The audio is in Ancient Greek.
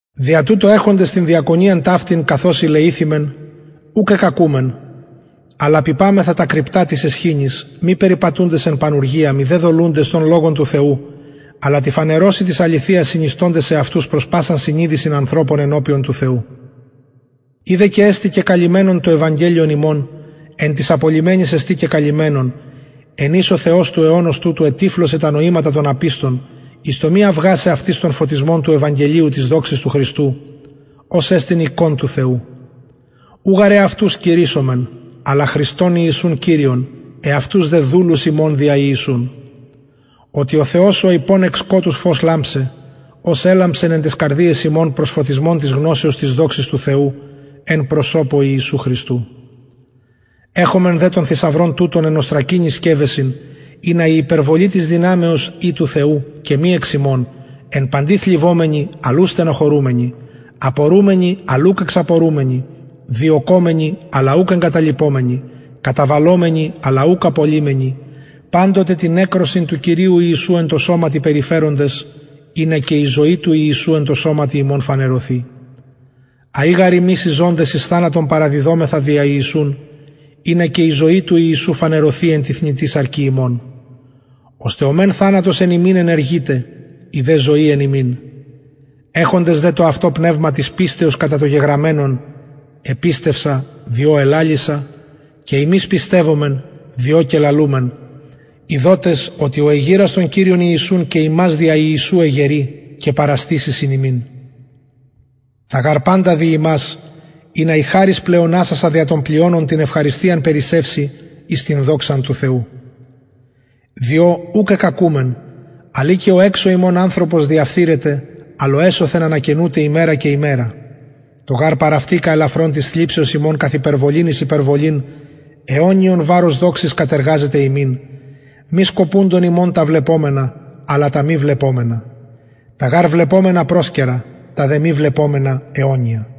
δια τουτο εχοντες την διακονιαν ταυτην καθως ηλεηθημεν ουκ εκκακουμεν αλλα απειπαμεθα τα κρυπτα της αισχυνης μη περιπατουντες εν πανουργια μηδε δολουντες τον λογον του θεου αλλα τη φανερωσει της αληθειας συνιστωντες εαυτους προς πασαν συνειδησιν ανθρωπων ενωπιον του θεου ει δε και εστιν κεκαλυμμενον το ευαγγελιον ημων εν τοις απολλυμενοις εστιν κεκαλυμμενον εν οις ο θεος του αιωνος τουτου ετυφλωσεν τα νοηματα των απιστων εις το μη αυγασαι αυτοις τον φωτισμον του ευαγγελιου της δοξης του χριστου ος εστιν εικων του θεου ου γαρ εαυτους κηρυσσομεν αλλα χριστον ιησουν κυριον εαυτους δε δουλους υμων δια ιησουν οτι ο θεος ο ειπων εκ σκοτους φως λαμψαι ος ελαμψεν εν ταις καρδιαις ημων προς φωτισμον της γνωσεως της δοξης του θεου εν προσωπω ιησου χριστου εχομεν δε τον θησαυρον τουτον εν οστρακινοις σκευεσιν ινα η υπερβολη της δυναμεως η του θεου και μη εξ ημων εν παντι θλιβομενοι αλλ ου στενοχωρουμενοι απορουμενοι αλλ ουκ εξαπορουμενοι διωκομενοι αλλ ουκ εγκαταλειπομενοι καταβαλλομενοι αλλ ουκ απολλυμενοι παντοτε την νεκρωσιν του κυριου ιησου εν τω σωματι περιφεροντες ινα και η ζωη του ιησου εν τω σωματι ημων φανερωθη αει γαρ ημεις οι ζωντες εις θανατον παραδιδομεθα δια ιησουν ινα και η ζωη του ιησου φανερωθη εν τη θνητη σαρκι ημων ωστε ο μεν θανατος εν ημιν ενεργειται η δε ζωη εν υμιν εχοντες δε το αυτο πνευμα της πιστεως κατα το γεγραμμενον επιστευσα διο ελαλησα και ημεις πιστευομεν διο και λαλουμεν ειδοτες οτι ο εγειρας τον κυριον ιησουν και ημας δια ιησου εγερει και παραστησει συν υμιν τα γαρ παντα δι υμας ινα η χαρις πλεονασασα δια των πλειονων την ευχαριστιαν περισσευση εις την δοξαν του θεου διο ουκ εκκακουμεν αλλ ει και ο εξω ημων ανθρωπος διαφθειρεται αλλ ο εσωθεν ανακαινουται ημερα και ημερα το γαρ παραυτικα ελαφρον της θλιψεως ημων καθ υπερβολην εις υπερβολην αιωνιον βαρος δοξης κατεργαζεται ημιν μη σκοπουντων ημων τα βλεπομενα αλλα τα μη βλεπομενα τα γαρ βλεπομενα προσκαιρα τα δε μη βλεπομενα αιωνια